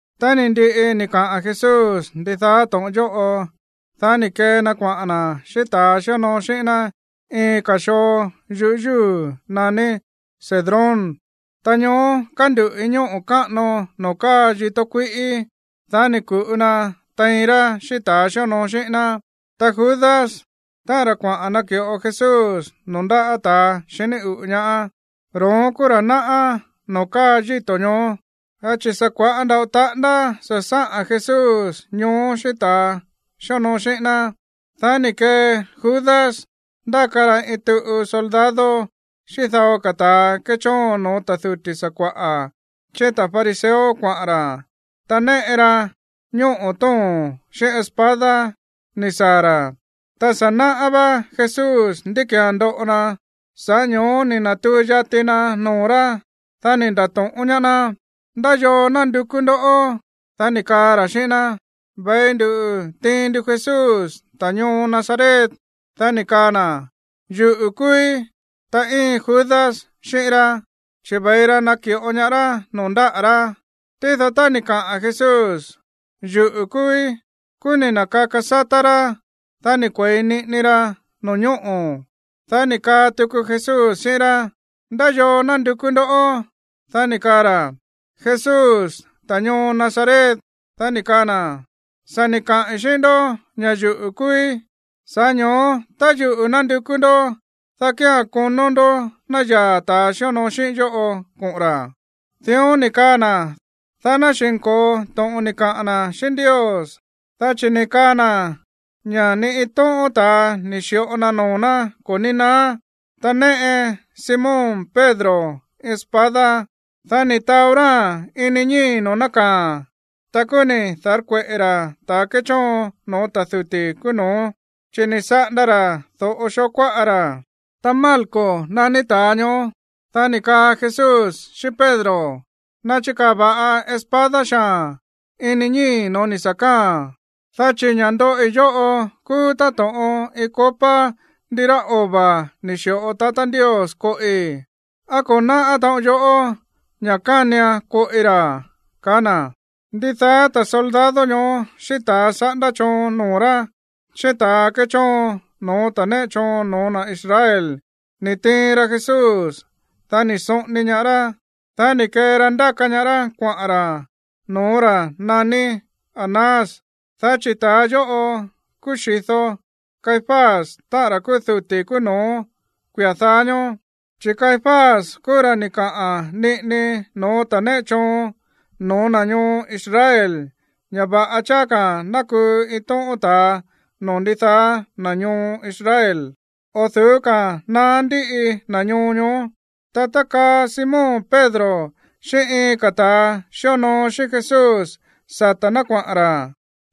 Tá ni̱ ndiꞌi ni̱ kaꞌa̱n Jesús ndidaá to̱ꞌon yóꞌo, dá ni̱ kee na kuaꞌa̱n na̱ xíꞌín ta̱ xíonoo xíꞌín ná iin ka̱ xoo yu̱yúu̱ naní Cedrón, ta ñoó kánduꞌu̱ iin ñóꞌo̱ káꞌano noo̱ káa yitó kuíꞌí. Dá ni̱ ku̱ꞌu na tein rá xíꞌín ta̱ xíonoo xíꞌín ná. Ta Judas, táꞌa̱n ra̱ kuaꞌa̱n naki̱ꞌo Jesús noo̱ ndáꞌa̱ ta̱a xiní uꞌu̱ ñaá, ro̱ón kúú ra̱ náꞌá noo̱ káa yíto̱ ñoó, dá chi̱ sa̱ kua̱ꞌá nda̱ꞌo taꞌándá sa̱ sáꞌa̱n Jesús ñoó xíꞌín ta̱a xíonoo xíꞌín ná. Dá ni̱ kee Judas ndáka ra iin tuꞌu soldado xíꞌín dao ka̱ ta̱a kéchóon no̱ó ta̱ duti̱ sakua̱ꞌa̱ xíꞌín ta̱ fariseo kuaꞌa̱n ra̱. Ta néꞌe ra ñóꞌo̱ tóo̱n xíꞌín espada ni̱ saa̱ ra̱. Ta sa̱ náꞌá vá Jesús ndí ki̱án ndoꞌo na, sa̱ꞌá ño̱ó ni̱ na̱tuu yati na noo̱ rá. Dá ni̱ nda̱to̱ꞌón ñaá ná: ―¿Ndá yoo nándukú ndó? Dá ni̱ kaa ra̱ xíꞌín ná: ―Ve̱i ndu tiin ndu Jesús, ta̱ ñoo Nazaret. Dá ni̱ kaa na̱: ―Yuꞌu̱ kúúí. Ta íin Judas xíꞌín rá, chi̱ ve̱i ra naki̱ꞌo ñaá rá noo̱ ndáꞌa̱ rá. Tído tá ni̱ kaꞌa̱n Jesús: “Yuꞌu̱ kúúí”, kúú ni̱ na̱kaka sátá rá, dá ni̱ kue̱i niꞌini ra no̱ñóꞌo̱. Dá ni̱ kaa tuku Jesús xíꞌín rá: ―¿Ndá yoo nándukú ndó? Dá ni̱ kaa ra̱: ―Jesús, ta̱ ñoo Nazaret. Dá ni̱ kaa na̱: ―Sa̱ ni̱ kaꞌi̱n xíꞌín ndó ña̱ yuꞌu̱ kúúí. Sa̱ꞌá ño̱ó, tá yuꞌu̱ nándukú ndó, dá kía̱n konó ndó ná yaa̱ ta̱ xíonoo xíꞌíín yóꞌo koꞌo̱n ra̱. Dión ni̱ kaa na̱, dá ná xi̱nko̱o to̱ꞌon ni̱ kaꞌa̱n na̱ xíꞌín Ndios, dá chi̱ ni̱ kaa na̱ ña̱ ni iin tóꞌón ta̱a ni̱ xi̱ꞌo na noo̱ ná ko̱ ní naá. Ta néꞌe Simón Pedro iin espada. Dá ni̱ taó ráa̱n ini ñíi̱ noo̱ nákaa̱a̱n, ta kúú ni̱ da̱rkueꞌe̱ ra̱ ta̱ kéchóon no̱ó ta̱ duti̱ kúú no̱ó, chi̱ ni̱ saꞌanda ra̱ do̱ꞌo xoo kuáꞌa ra̱. Ta Malco naní ta̱a ñoó. Dá ni̱ kaa Jesús xíꞌín Pedro: ―Nachikaa̱ va̱ꞌa espada xaa̱n ini ñíi̱ no̱ó ni̱ sa̱ káa̱a̱n, dá chi̱ ña̱ ndóꞌi yóꞌo kúú táto̱ꞌon iin copa ndirá ova̱ ni̱ xi̱ꞌo tatá Ndios koꞌi. ¿Á ko̱ náꞌá taꞌon yoꞌó ña̱ kánian koꞌi ra̱? ―kaá na̱. Ndidaá ta̱ soldado ñoó xíꞌín ta̱ saꞌándá choon noo̱ rá, xíꞌín ta̱ kéchóon no̱ó ta̱ néꞌe choon no̱ó na̱ Israel ni̱ tiin ra Jesús, dá ni̱ soꞌoni ñaá rá, dá ni̱ kee ra ndáka ñaá rá kuaꞌa̱n ra̱ no̱ó ra̱ naní Anás, dá chi̱ ta̱ yóꞌo kúú xi̱do Caifás, táꞌa̱n ra̱ kúú duti̱ kúú no̱ó kuia̱ dáá ñóó. Ta Caifás kúú ra̱ ni̱ kaꞌa̱n niꞌini no̱ó ta̱ néꞌe choon no̱ó na̱ ñoo Israel ña̱ va̱ꞌa cháá ka̱ ná kuu iin tóꞌón ta̱a noo̱ ndidaá na̱ ñoo Israel o̱ du̱ú ka̱a̱n naá ndíꞌi na̱ ñoo ñoó. Ta tákaa Simón Pedro xíꞌín iin ka̱ ta̱ xíonoo xíꞌín Jesús sata̱ ná kuaꞌa̱n ra̱.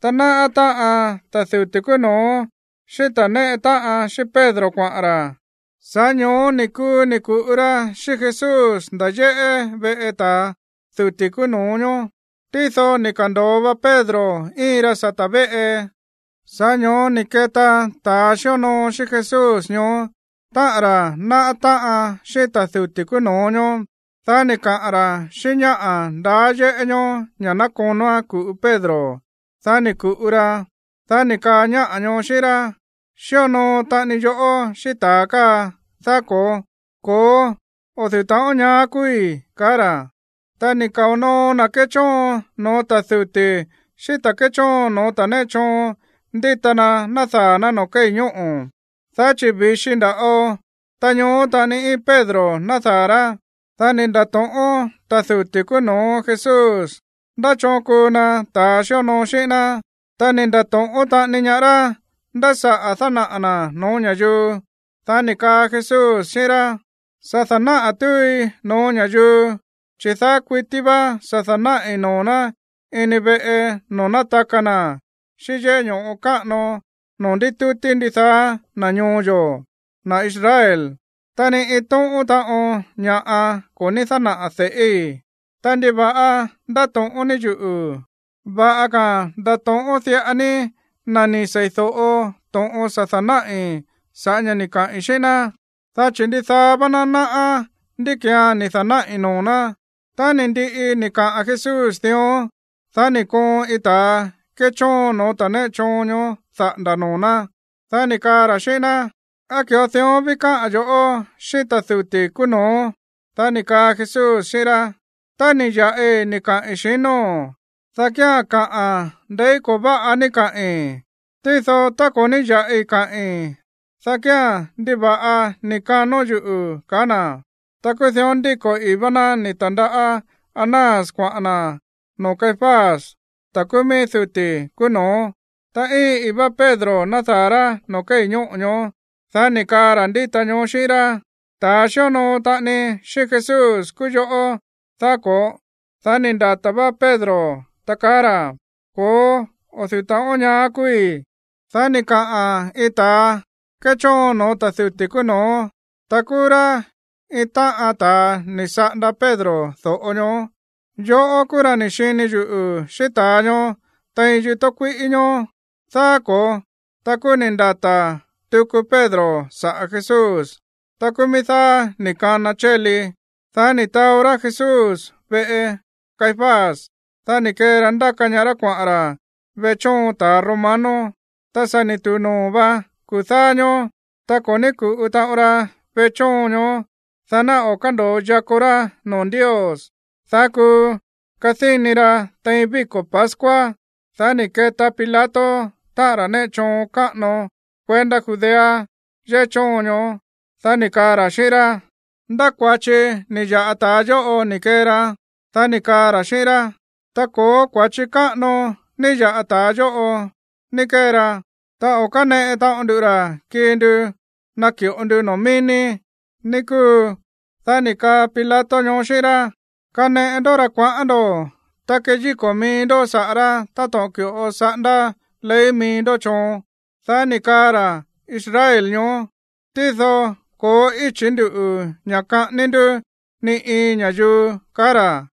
Ta náꞌá táꞌan ta̱ duti̱ kúú no̱ó xíꞌín ta̱ néꞌe táꞌan xíꞌín Pedro kuaꞌa̱n ra̱. Sa̱ꞌá ño̱ó ni̱ kuu ni̱ ku̱ꞌu ra xíꞌín Jesús nda̱ yéꞌé veꞌe ta̱ duti̱ kúú no̱ó ñoó. Tído ni̱ ka̱ndo̱o va Pedro íin ra sata̱ véꞌe. Sa̱ꞌá ño̱ó ni̱ keta ta̱ xíonoo xíꞌín Jesús ñoó, táꞌa̱n ra̱ náꞌá táꞌan xíꞌín ta̱ duti̱ kúú no̱ó ñoó. Dá ni̱ kaꞌa̱n ra̱ xíꞌín ñáꞌa̱ ndaá yéꞌé ñoó ña̱ ná konóán ku̱ꞌu Pedro. Dá ni̱ ku̱ꞌu ra. Dá ni̱ kaa ñáꞌa̱ ñoó xíꞌín rá: ―Xíonoo taꞌani yoꞌó xíꞌín ta̱a káa, ¿daá ko̱ó? ―Ko̱ó, o̱ du̱ú taꞌon ñaá kúúí ―kaá ra̱. Ta ni̱ kao̱ noo na̱ kéchóon no̱ó ta̱ duti̱ xíꞌín ta̱ kéchóon no̱ó ta̱ néꞌe choon ndíta na nádaa̱ ná noo̱ kéi̱ ñóꞌo̱, dá chi̱ vi̱xi nda̱ꞌo. Ta ñoó taꞌani íin Pedro nádaa̱ rá. Dá ni̱ nda̱to̱ꞌón ta̱ duti̱ kúú no̱ó Jesús ndá choon kuu na ta̱ xíonoo xíꞌín ná, ta ni̱ nda̱to̱ꞌón taꞌani ñaá rá ndá saꞌa̱ dánaꞌa̱ na̱ no̱ó ña̱yuu. Dá ni̱ kaa Jesús xíꞌín rá: ―Sa̱ da̱náꞌa̱ túui no̱ó ña̱yuu, chi̱ daá kuití vá sa̱ da̱náꞌi̱ noo̱ ná ini veꞌe noo̱ nátaka na̱ xíꞌín yéꞌé ño̱ꞌo káꞌano noo̱ ndítútí ndidaá na̱ ñoo yo̱, na̱ Israel, ta ni iin tóꞌón taꞌon ña̱ꞌa ko̱ ní dánaꞌa̱ de̱ꞌíi̱. Ta, ¿ndiva̱ꞌa ndáto̱ꞌón ní yuꞌu̱? Va̱ꞌa ka̱ ndato̱ꞌón diꞌa ní na̱ ni̱ seídóꞌo to̱ꞌon sa̱ da̱náꞌi̱ sa̱ꞌá ña̱ ni̱ kaꞌi̱n xíꞌín ná, dá chi̱ ndidaá vá ná náꞌá ndí ki̱án ni̱ da̱náꞌi̱ noo̱ ná. Tá ni̱ ndiꞌi ni̱ kaꞌa̱n Jesús dión, dá ni̱ koon iin ta̱ kéchóon no̱ó ta̱ néꞌe choon daꞌa̱nda̱ noo̱ ná, dá ni̱ kaa ra̱ xíꞌín ná: ―¿Á ki̱ꞌo dión ví káꞌa̱n yo̱ꞌó xíꞌín ta̱ duti̱ kúú no̱ó? Dá ni̱ kaa Jesús xíꞌín rá: ―Tá ni̱ ya̱ꞌi ni̱ kaꞌi̱n, xinóo̱n, dá kía̱n, kaꞌa̱n ndeí ko̱ váꞌa ni̱ kaꞌi̱n. Tído tá ko̱ ní ya̱ꞌi káꞌi̱n, dá kía̱n, ¿ndiva̱ꞌa ni̱ kanón yuꞌu̱? ―kaá na̱. Ta kúú dión ndíko̱ ii̱ vá ná ni̱ ta̱ndaꞌá ñaá Anás kuaꞌa̱n na̱ noo̱ Caifás, ta̱ kúú mií ta̱ duti̱ kúú no̱ó. Ta íin ii̱ vá Pedro nádaa̱ rá noo̱ kéi̱ ñóꞌo̱ ñoó. Dá ni̱ kaa ra̱ ndíta ñoó xíꞌín rá: ―Ta̱a xíonoo taꞌani xíꞌín Jesús kúú yoꞌó, ¿daá ko̱ó? Dá ni̱ ndata̱ vá Pedro, ta kaá ra̱: ―Ko̱ó, o̱ du̱ú ta̱ꞌón ñaá kúúí. Dá ni̱ kaa iin ta̱ kéchóon no̱ó ta̱ duti̱ kúú no̱ó, ta kúú rá iin táꞌan ta̱a ni̱ saꞌanda Pedro do̱ꞌo ñoó: ―Yoꞌó kúú ra̱ ni̱ xini yuꞌu̱ xíꞌín ta̱a ñoó tein yitó kuíꞌí ñoó, ¿daá ko̱ó? Ta kúú ni̱ ndata̱ tuku Pedro saꞌa̱ Jesús. Ta kúú mií dáá ni̱ kana chéli. Dá ni̱ taó rá Jesús veꞌe Caifás, dá ni̱ kee ra ndáka ñaá rá kuaꞌa̱n ra̱ veꞌe chóon ta̱ romano. Ta sa̱ ni̱ tu̱u noo̱ vá kuu̱ dáá ñóó, ta ko̱ ní ku̱ꞌu taꞌon ra veꞌe chóon ñoó, dá ná o̱ kándo̱o yakó rá noo̱ Ndios, dá kuu kadíni ra̱ tein víko̱ pascua. Dá ni̱ keta Pilato, táꞌa̱n ra̱ néꞌe choon káꞌano kuendá Judea yéꞌé chóon ñoó. Dá ni̱ kaa ra̱ xíꞌín rá: ―¿Ndá kua̱chi ni̱ ya̱ꞌa ta̱a yóꞌo ni̱ kee ra? Dá ni̱ kaa ra̱ xíꞌín rá: ―Tá ko̱ó kua̱chi káꞌano ní ya̱ꞌa ta̱a yóꞌo ni̱ kee ra, ta o̱ káneꞌe taꞌon ndu ra̱ kii ndu naki̱ꞌo ndu noo̱ mií ní, ní kúu. Dá ni̱ kaa Pilato ñoó xíꞌín rá: ―Kaneꞌe ndó ra̱ kuaꞌán ndo̱, ta keyíko̱ mií ndó saꞌa̱ rá táto̱ꞌon ki̱ꞌo saꞌándá ley mií ndó choon. Dá ni̱ kaa ra̱ Israel ñoó: ―Tído ko̱ó íchi̱ ndú ña̱ kaꞌání ndú ni iin ña̱yuu ―kaá ra̱.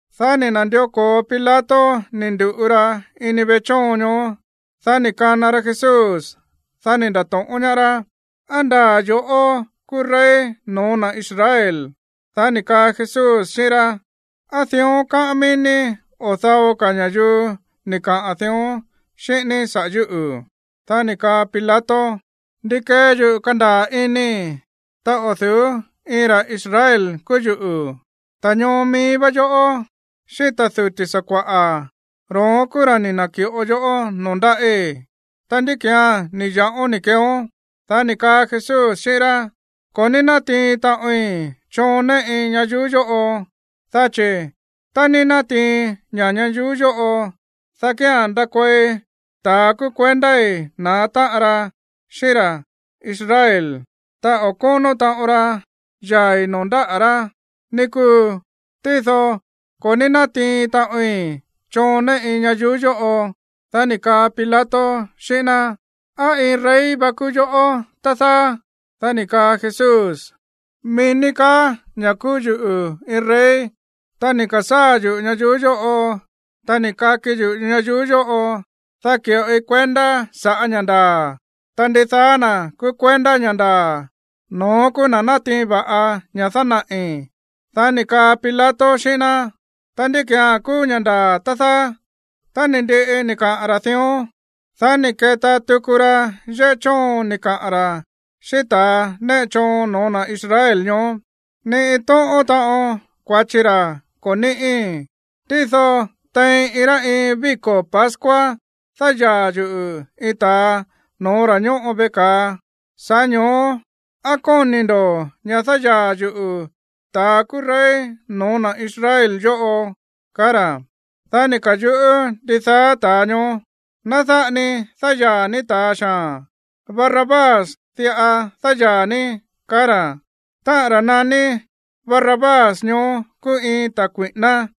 Dá ni̱ na̱ndió ko̱o Pilato ni̱ ndu̱ꞌu ra ini veꞌe chóon ñoó. Dá ni̱ kana ra Jesús, dá ni̱ nda̱to̱ꞌón ñaá rá: ―¿Á ndaa̱ yo̱ꞌó kúú rey no̱ó na̱ Israel? Dá ni̱ kaa Jesús xíꞌín rá: ―¿Á dión káꞌán mií ní, o dao ka̱ ña̱yuu ni̱ kaꞌa̱n dión xíꞌín ní saꞌa̱ yúꞌu̱? Dá ni̱ kaa Pilato: ―¿Ndi kee yuꞌu̱ kandaa̱ inii̱, ta o̱ du̱ú iin ra̱ Israel kúú yuꞌu̱? Ta̱ ñoo mií vá yoꞌó xíꞌín ta̱ duti̱ sakua̱ꞌa̱, ro̱ón kúú ra̱ ni̱ na̱ki̱ꞌo yoꞌó noo̱ ndáꞌí. Ta, ¿ndí ki̱án ni̱ ya̱ꞌón ni̱ keeón? Dá ni̱ kaa Jesús xíꞌín rá: ―Ko̱ ní nátiin taꞌoin choon néꞌi ñayuú yóꞌo. Dá chi̱ tá ní nátiin ña ñayuú yóꞌo, dá kía̱n ndakuei ta̱a kúú kuendái̱ na̱á táꞌan ra xíꞌín ra̱ Israel, ta o̱ kónó taꞌon ra yaa̱i̱ noo̱ ndáꞌa̱ rá, ní kúu. Tído ko̱ ní nátiin taꞌoin choon néꞌi ñayuú yóꞌo. Dá ni̱ kaa Pilato xíꞌín ná: ―¿Á iin rey va kúú yoꞌó, tá dáá? Dá ni̱ kaa Jesús: ―Mií ní kaá ña̱ kúú yuꞌu̱ iin rey. Ta ni̱ ka̱sáa̱ yuꞌu̱ ñayuú yóꞌo, ta ni̱ kaki yuꞌu̱ ñayuú yóꞌo, dá ki̱ꞌoi kuendá sa̱ꞌá ña̱ ndaa̱. Ta ndidaá na̱ kúú kuendá ña̱ ndaa̱, no̱ón kúú na̱ nátiin va̱ꞌa ña̱ dánaꞌi̱. Dá ni̱ kaa Pilato xíꞌín ná: ―Ta, ¿ndí ki̱án kúú ña̱ ndaa̱, tá dáá? Tá ni̱ ndiꞌi ni̱ kaꞌa̱n ra̱ dión, dá ni̱ keta tuku ra yéꞌé chóon ni̱ kaꞌa̱n ra̱ xíꞌín ta̱ néꞌe choon no̱ó na̱ Israel ñoó: ―Ni iin tóꞌón taꞌon kua̱chi ra ko̱ níꞌí. Tído tein iin rá iin víko̱ pascua dáyaa̱ yuꞌu̱ iin ta̱a no̱ó ra̱ ñóꞌo veꞌe ka̱a. Sa̱ꞌá ño̱ó, ¿á kóni̱ ndo̱ ña̱ dáyaa̱ yuꞌu̱ ta̱a kúú rey no̱ó na̱ Israel yóꞌo? ―kaá ra̱. Dá ni̱ ka̱yuꞌú ndidaá ta̱a ñoó: ―¡Ná dáꞌa ni dáyaa̱ ní ta̱a xaa̱n! ¡Barrabás diꞌa dáyaa̱ ní! ―kaá ra̱. Táꞌa̱n ra̱ naní Barrabás ñoó kúú iin ta̱ kui̱ꞌíná.